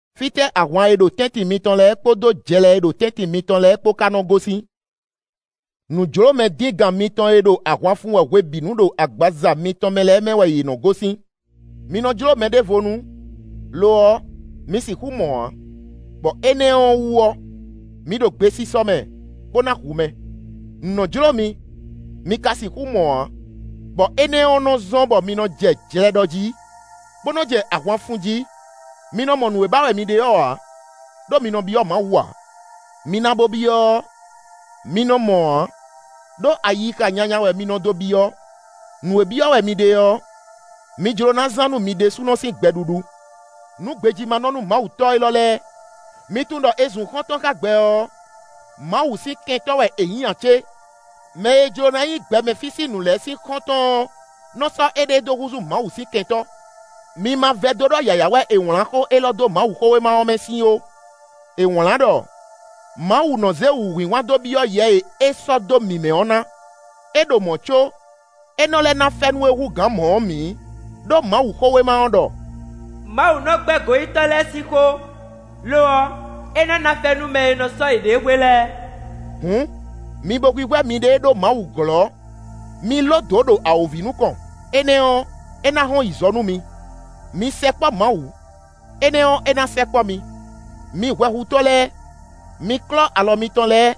Fítɛ́ ahwan e ɖo tɛ́ntin mitɔn lɛ́ɛ kpódó jlɛ e ɖo tɛ́ntin mitɔn lɛ́ɛ kpó ka nɔ gosín? Nǔjlómɛ díngan mitɔn e ɖo ahwan fun wɛ hwebǐnu ɖo agbaza mitɔn mɛ lɛ́ɛ mɛ wɛ yě nɔ gosín. Mi nɔ jló mɛɖévonú; lo ɔ́, mi sixú mɔ ǎ; bɔ énɛ́ ɔ́ wú ɔ́, mi ɖo gbesisɔ mɛ, bó ná hu mɛ; nǔ nɔ jló mi; mi ka sixú mɔ ǎ, bɔ énɛ́ ɔ́ nɔ́ zɔ́n bɔ mi nɔ jɛ jlɛ ɖɔ jí, bó nɔ jɛ ahwan fun jí. Mi nɔ mɔ nǔ e ba wɛ mi ɖe ɔ́ ǎ, ɖó mi nɔ byɔ́ Mawu ǎ. Mi na bo byɔ́ ɔ́, mi nɔ mɔ ǎ, ɖó ayixa nyanya wɛ mi nɔ dó byɔ́: nǔ e byɔ́ wɛ mi ɖe ɔ́, mi jló ná zán nú mi ɖésúnɔ sín gbɛɖuɖu. Nǔ gbejímánɔ-númawutɔ́ élɔ́ lɛ́ɛ! Mi tunwun ɖɔ è zun xɔ́ntɔn xá gbɛ ɔ́, Mawu sín kɛntɔ́ wɛ è nyǐ ǎ cé? Mɛ e jló ná nyí gbɛmɛ fí sín nǔ lɛ́ɛ sín xɔ́ntɔn ɔ́ nɔ sɔ́ éɖée dó húzú Mawu sín kɛntɔ́. Mi ma vɛdó ɖɔ yǎyá wɛ è wlǎn xó élɔ́ dó Mawuxówéma ɔ́ mɛ sín ó: è wlǎn ɖɔ: “Mawu nɔ zé wǔhwinhwan dó byɔ́ yɛ e é sɔ́ dó mǐ mɛ ɔ́ ná.” É ɖo mɔ̌ có, é nɔ lɛ́ ná fɛ́nú e hú gǎn mɔ̌ ɔ́ mǐ; ɖó Mawuxówéma ɔ́ ɖɔ: “Mawu nɔ gbɛ́ goyítɔ́ lɛ́ɛ sín xó; lo ɔ́, é nɔ ná fɛ́nú mɛ e nɔ sɔ́ yěɖée hwe lɛ́ɛ.” Hǔn, mi bo hwíhwɛ́ miɖée ɖó Mawu glɔ́; mi ló dǒ ɖo awǒvi nukɔn; énɛ́ ɔ́, é ná hɔn yi zɔ nú mi. Mi sɛkpɔ́ Mawu; énɛ́ ɔ́ é ná sɛkpɔ́ mi. Mi hwɛhutɔ́ lɛ́ɛ, mi klɔ́ alɔ mitɔn lɛ́ɛ;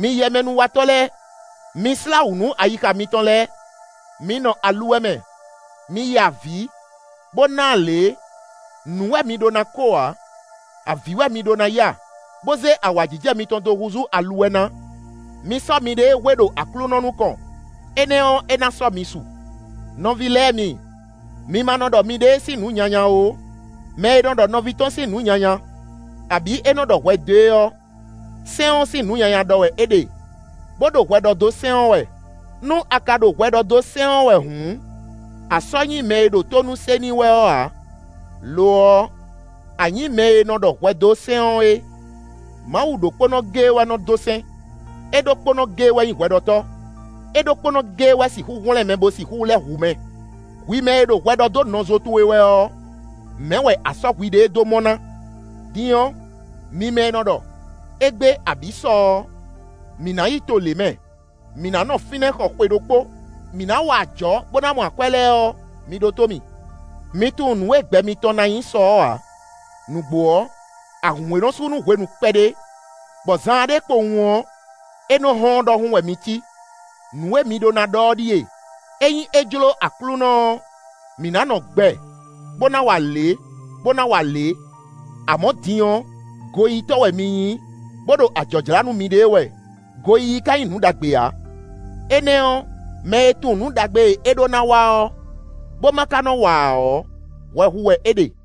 mi yɛmɛnúwatɔ́ lɛ́ɛ, mi slá wǔ nú ayixa mitɔn lɛ́ɛ! Mi nɔ aluwɛ mɛ; mi ya avǐ, bó ná alě; nǔ wɛ mi ɖó ná ko ǎ; avǐ wɛ mi ɖó ná ya, bó zé awǎjijɛ mitɔn dó húzú aluwɛ ná. Mi sɔ́ miɖée hwe ɖo Aklúnɔ nukɔn, énɛ́ ɔ́ é ná sɔ́ mi su. Nɔví lɛ́ɛ mi, mi ma nɔ ɖɔ miɖée sín nǔ nyanya ó. Mɛ e nɔ ɖɔ nɔví tɔn sín nǔ nyanya, abǐ é nɔ ɖɔ hwɛ dó e ɔ́, sɛ́n ɔ́ sín nǔ nyanya ɖɔ wɛ é ɖe, bó ɖo hwɛ ɖɔ dó sɛ́n ɔ́ wɛ. Nú a ka ɖo hwɛ ɖɔ dó sɛ́n ɔ́ wɛ hǔn, a sɔ́ nyí mɛ e ɖo tónú se n'i wɛ ɔ́ ǎ; lo ɔ́, a nyǐ mɛ e nɔ ɖɔ hwɛ dó sɛ́n ɔ́ é. Mawu ɖokpónɔ géé wɛ nɔ dó sɛ́n; é ɖokpónɔ géé wɛ nyí hwɛɖɔtɔ́; é ɖokpónɔ géé wɛ sixú hwlɛ́n mɛ bo sixú lɛ́ hu mɛ. Hwi mɛ e ɖo hwɛ ɖɔ dó nɔzo towe wɛ ɔ́, mɛ̌ wɛ a sɔ́ hwiɖée dó mɔ ná? Din ɔ́, mi mɛ e nɔ ɖɔ: “Égbé abǐ sɔ ɔ́, mǐ ná yi to lě mɛ; mǐ ná nɔ fínɛ́ xɔ xwe ɖokpó; mǐ ná wa ajɔ̌ bó ná mɔ akwɛ́” lɛ́ɛ ɔ́, mi ɖótó mì. Mi tunwun nǔ e gbɛ mitɔn ná nyí sɔ ɔ́ ǎ! Nǔgbó ɔ́, ahǔn e nɔ sú nú hwenu kpɛɖé, bɔ zaanɖé kpowun ɔ́, é nɔ hɔ́n ɔ́ ɖɔhun wɛ mi cí. Nǔ e mi ɖó ná ɖɔ ɔ́ ɖíe: “Ényí é jló Aklúnɔ ɔ́, mǐ ná nɔ gbɛ, bó ná wa lě, bó ná wa lě.” Amɔ̌ din ɔ́, goyítɔ́ wɛ mi nyí, bó ɖo ajɔ̌ jlá nú miɖée wɛ. Goyíyí ka nyí nǔ ɖagbe ǎ. Énɛ́ ɔ́, mɛ e tunwun nǔ ɖagbe e é ɖó ná wa ɔ́, bó ma ka nɔ wa ǎ ɔ́, hwɛ hu wɛ é ɖe.